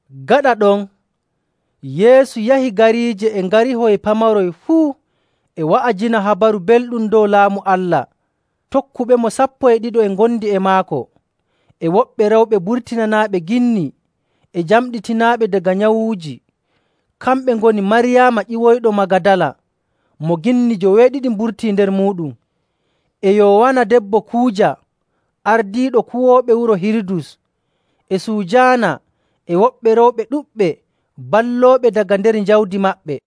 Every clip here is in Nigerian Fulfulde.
Gaɗa ɗon, Yeesu yahi gariije e ngarihoy pamaroy fuu, e wa'ajina Habaru Belɗum dow Laamu Allah. Tokkuɓemo sappo e ɗiɗo e ngondi e maako, e woɓɓe rewɓe burtinanaaɓe ginni e jamɗitinaaɓe daga nyawuuji. Kamɓe ngoni Maryaama ƴiwoyɗo Magadala, mo ginni joweeɗiɗi mburtii nder muuɗum, e Yowaana, debbo Kuuja, ardiiɗo kuwooɓe wuro Hirudus, e Sujaana, e woɓɓe rewɓe ɗuɗɓe, ballooɓeɓe daga nder jawdi maɓɓe..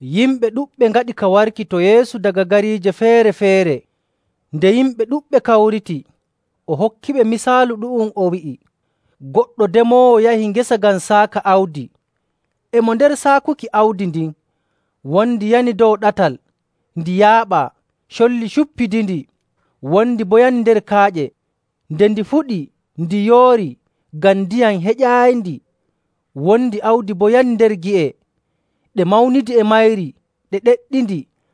Yimɓe ɗuɗɓe ngaɗi ka warki to Yeesu daga gariije feere‑feere. Nde yimɓe ɗuɗɓe kawriti, o hokkiɓe misaalu ɗu'um, o wi'i, “Goɗɗo demoowo yahi ngesa ngam saaka awdi. E mo nder saakuki awdi ndin, wondi yani dow ɗatal, ndi yaaɓaa, colli cuppidindi. Wondi boo yani nder kaaƴe, nde ndi fuɗi, ndi yoori ngam ndiyam heƴaayindi. Wondi awdi boo yani nder gi'e, ɗe mawnidi e mayri, ɗe ɗeɗɗindi.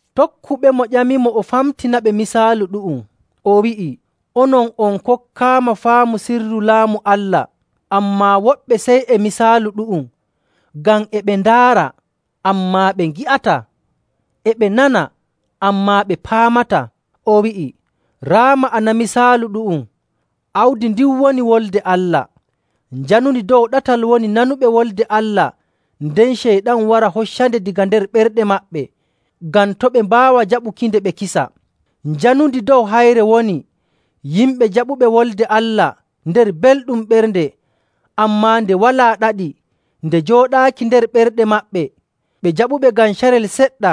Tokkuɓemo ƴamimo o famtinaɓe misaalu ɗu'um. O wi'i, “Onon on kokkaama faamu sirru Laamu Allah, ammaa woɓɓe sey e misaalu ɗu'um, ngam ‘e ɓe ndaara, ammaa ɓe ngi'ataa; e ɓe nana, ammaa ɓe paamataa.’”. O wi'i, “Raa ma'ana misaalu ɗu'um: Awdi ndin woni Wolde Allah. Njanundi dow ɗatal woni nanuɓe Wolde Allah, nden Ceyɗan wara hoccande daga nder ɓerɗe maɓɓe, ngam to' ɓe mbaawa jaɓukinde ɓe kisa. Njanundi dow hayre woni yimɓe jaɓuɓe Wolde Allah nder belɗum ɓernde, ammaa nde walaa ɗaɗi, nde jooɗaaki nder ɓerɗe maɓɓe. Ɓe njaɓunde ngam carel seɗɗa,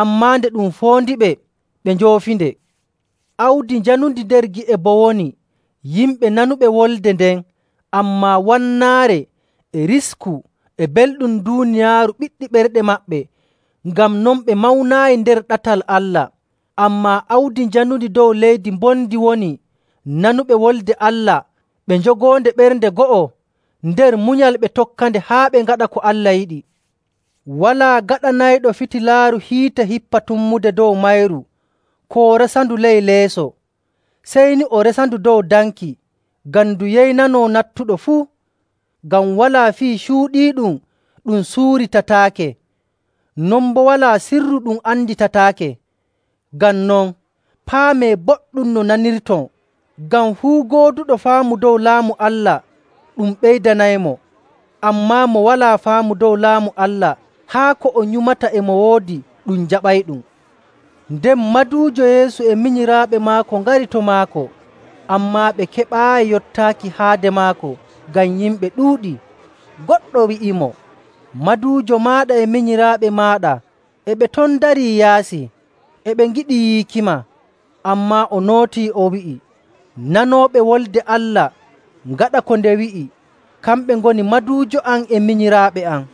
ammaa nde ɗum foondiɓe, ɓe njoofinde. Awdi njanundi nder gi'e boo woni yimɓe nanuɓe Wolde nden, ammaa wannaare, e risku, e belɗum duuniyaaru ɓiɗɗi ɓerɗe maɓɓe, ngam non ɓe mawnaayi nder ɗatal Allah. Ammaa awdi janundi dow leydi mbondi woni nanuɓe Wolde Allah, ɓe njogoonde ɓernde go'o, nder munyal ɓe tokkande haa ɓe ngaɗa ko Allah yiɗi. “Walaa gaɗanayɗo fitilaaru hiite hippa tummude dow mayru koo resandu ley leeso. Sey ni o resandu dow danki, ngam ndu yeynanoo nattuɗo fuu.. “Ngam walaa fii cuuɗiiɗum ɗum suuritataake. Non boo walaa sirru ɗum anditataake.. “Ngam non paamee boɗɗum no nanirton. Ngam fuu gooduɗo faamu dow Laamu Allah ɗum ɓeydanaymo. Ammaa mo walaa faamu dow Laamu Allah, haa ko o nyumata e mo woodi ɗum jaɓayɗum.”. Nden maduujo Yeesu e minyiraaɓe maako ngari to maako, ammaa ɓe keɓaayi yottaaki haade maako ngam yimɓe ɗuuɗii. Goɗɗo wi'imo, “Maduujo maaɗa e minyiraaɓe maaɗa e ɓe ton ndarii yaasi, e ɓe ngiɗi yiikima.” Ammaa o nootii, o wi'i, “Nanooɓe Wolde Allah, ngaɗa ko nde wi'i, kamɓe ngoni maduujo am e minyiraaɓe am.”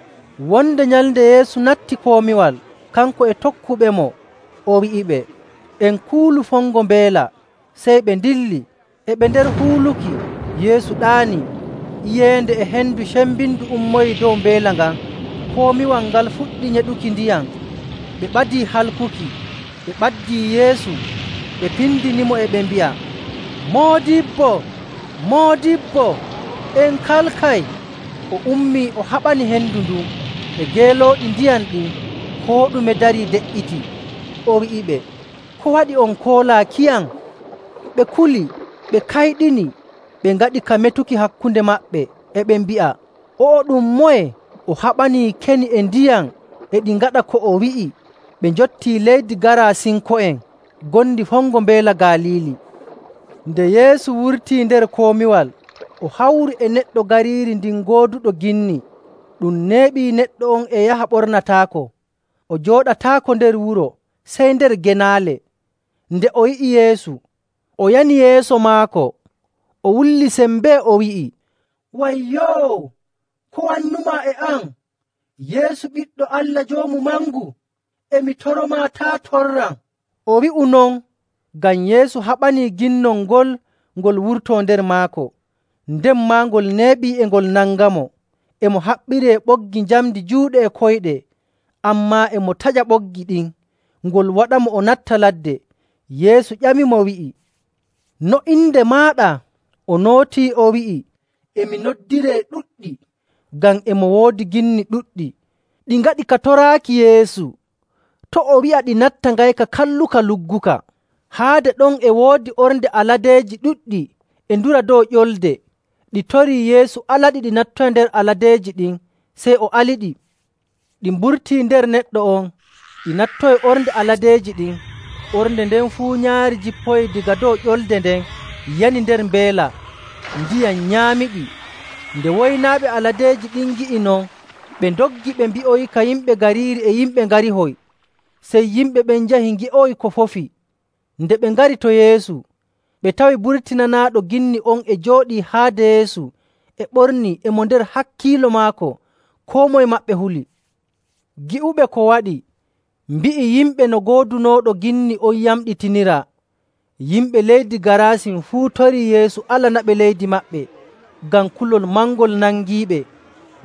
Wonde nyalnde Yeesu natti komiwal, kanko e tokkuɓemo, o wi'iɓe, “En kuulu fongo mbeela.” Sey ɓe ndilli. E ɓe nder huuluki, Yeesu ɗaanii. Iyeende e hendu cembindu ummoyii dow mbeela ngan, komiwal ngal fuɗɗi nyeɗuki ndiyam, ɓe ɓadii halkuki. Ɓe ɓaddii Yeesu, ɓe pindinimo, e ɓe mbi'a, “Moodibbo, Moodibbo, en kalkay!” O ummii, o haɓani hendu ndun e geelooɗi ndiyam ɗin. Koo ɗume darii, de''iti. O wi'iɓe, “Ko waɗi on koolaakiyam?” Ɓe kuli, ɓe kayɗini, ɓe ngaɗi ka metuki hakkunde maɓɓe, e ɓe mbi'a, “O'o ɗum moye? O haɓanii keni e ndiyam, e ɗi ngaɗa ko o wi'i!” Ɓe njottii leydi Gaarasinko'en ngondi fongo Mbeela Galiili. Nde Yeesu wurtii nder komiwal, o hawri e neɗɗo gariiri ndin gooduɗo ginni. Ɗum neeɓii neɗɗo on e yaha ɓornataako, o jooɗataako nder wuro, sey nder genaale. Nde o yi'i Yeesu, o yani yeeso maako, o wulli sembee, o wi'i, “Wayyoo! Ko wannumaa e am, Yeesu Ɓiɗɗo Allah Joomu Mangu? E mi toromaa, taa' torram.” O wi'u non ngam Yeesu haɓanii ginnol ngol ngol wurtoo nder maako. Nden maa, ngol neeɓi e ngol nangamo. E mo haɓɓiree ɓoggi njamndi juuɗe e koyɗe, ammaa e mo taƴa ɓoggi ɗin, ngol waɗamo o natta ladde. Yeesu ƴamimo, wi'i, “No inde maaɗa?” O nootii o wi'i, “E mi noddiree Ɗuɗɗi,” ngam e mo woodi ginni ɗuɗɗi. Ɗi ngaɗi ka toraaki Yeesu to' o wi'a ɗi natta ngayka kalluka lugguka. Haade ɗon e woodi ornde aladeeji ɗuɗɗi e ndura dow ƴolde. Ɗi torii Yeesu alaɗi ɗi nattoyi nder aladeeji ɗin. Sey o aliɗi. Ɗi mburtii nder neɗɗo on, ɗi nattoyi ornde aladeeji ɗin. Ornde nden fuu nyaari jippoyii daga dow ƴolde nden, yani nder mbeela, ndiyam nyaamiɗi. Nde woynaaɓe aladeeji ɗin ngi'i non, ɓe ndoggi, ɓe mbi'oyika yimɓe gariiri e yimɓe ngarihoy. Sey yimɓe ɓen njahi ngi'oya ko fofi. Nde ɓe ngari to Yeesu, ɓe tawi burtinanaaɗo ginni on e jooɗii haade Yeesu, e ɓornii, e mo nder hakkiilo maako. Koo moye maɓɓe huli. Gi'uɓe ko waɗi mbi'i yimɓe no goodunooɗo ginni on yamɗitiniraa. Yimɓe leydi Gaarasin fuu torii Yeesu alanaɓe leydi maɓɓe, ngam kulol mangol nangiiɓe.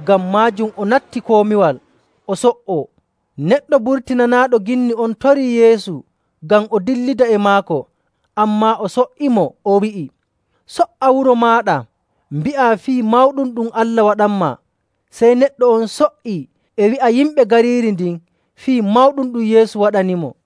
Ngam maajum o natti komiwal o so''o. Neɗɗo burtinanaaɗo ginni on torii Yeesu ngam o dillida e maako, ammaa o so''imo, o wi'i, “So''a wuro maaɗa, mbi'aa fii mawɗum ɗum Allah waɗanmaa.” Sey neɗɗo on so''ii e wi'a yimɓe gariiri ndin fii mawɗum ɗum Yeesu waɗanimo.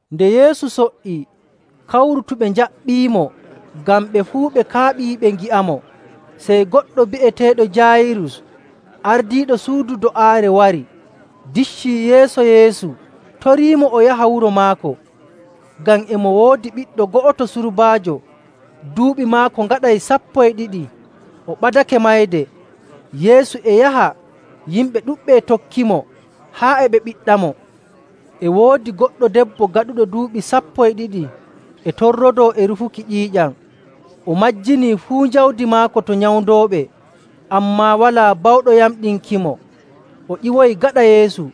Nde Yeesu so''ii, kawrutuɓe njaɓɓiimo, ngam ɓe fuu ɓe kaaɓii ɓe ngi'amo. Sey goɗɗo bi'eteeɗo Jaayirus, ardiiɗo suudu do'aare wari, diccii yeeso Yeesu, toriimo o yaha wuro maako, ngam e mo woodi ɓiɗɗo go'oto surbaajo, duuɓi maako ngaɗay sappo e ɗiɗi, o ɓadake mayde. Yeesu e yaha, yimɓe ɗuɗɓe e tokkimo haa e ɓe ɓiɗɗamo. E woodi goɗɗo debbo gaɗuɗo duuɓi sappo e ɗiɗi e torrodoo e rufuki ƴiiƴam. O majjinii fuu jawdi maako to nyawndooɓe, ammaa walaa bawɗo yamɗinkimo. O ƴiwoyi gaɗa Yeesu,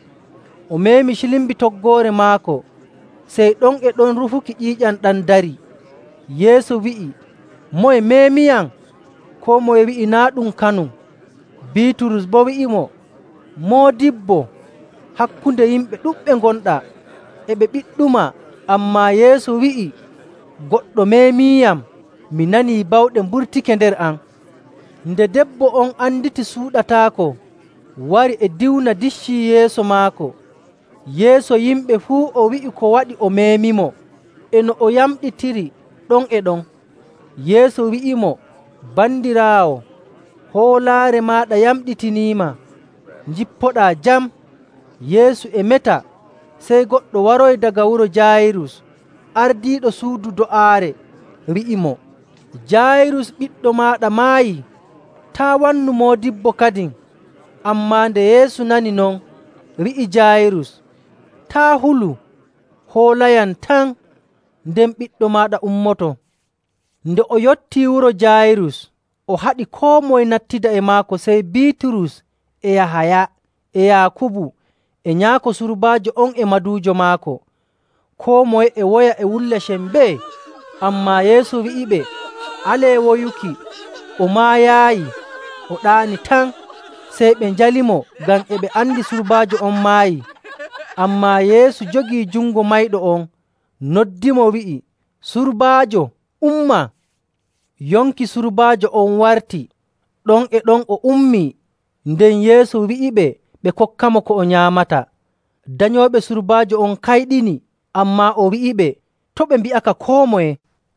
o meemi cilmbi toggoore maako. Sey ɗon e ɗon rufuki ƴiiƴam ɗam darii. Yeesu wi'i, “Moye meemiyam?” Koo moye wi'i naa' ɗum kanum. Biiturus boo wi'imo, “Moodibbo, hakkunde yimɓe ɗuɗɓe ngonɗaa, e ɓe ɓiɗɗumaa.” Ammaa Yeesu wi'i, “Goɗɗo meemiiyam. Mi nanii bawɗe mburtake nder am.” Nde debbo on anditi suuɗataako, wari e diwna, diccii yeeso maako. Yeeso yimɓe fuu o wi'i ko waɗi o meemimo, e no o yamɗitiri ɗon e ɗon. Yeesu wi'imo, “Bandiraawo, hoolaare maaɗa yamɗitiniima. Njippoɗaa jam.” Yeesu e meta, sey goɗɗo waroyi daga wuro Jaayirus ardiiɗo suudu do'aare, wi'imo, “Jaayirus, ɓiɗɗo maaɗa maayi. Taa' wannu moodibbo kadin.” Ammaa nde Yeesu nani non, wi'i Jaayirus, “Taa' hulu, hoolayam tan, nden ɓiɗɗo maaɗa ummoto.” Nde o yottii wuro Jaayirus, o haɗi koo moye nattida e maako, sey Biiturus, e Yahaya, e Yaakubu, e nyaako surbaajo on e maduujo maako. Koo moye e woya e wulla sembee. Ammaa Yeesu wi'iɓe, “Alee woyuki. O maayaayi, o ɗaani tan.” Sey ɓe njalimo ngam e ɓe andi surbaajo on maayi. Ammaa Yeesu jogii jungo mayɗo on, noddimo, wi'i, “Surbaajo, umma!” Yonki surbaajo on warti, ɗon e ɗon o ummii. Nden Yeesu wi'iɓe ɓe kokkamo ko o nyaamata. Danyooɓe surbaajo on kayɗini, ammaa o wi'iɓe to' ɓe mbi'aka koo moye.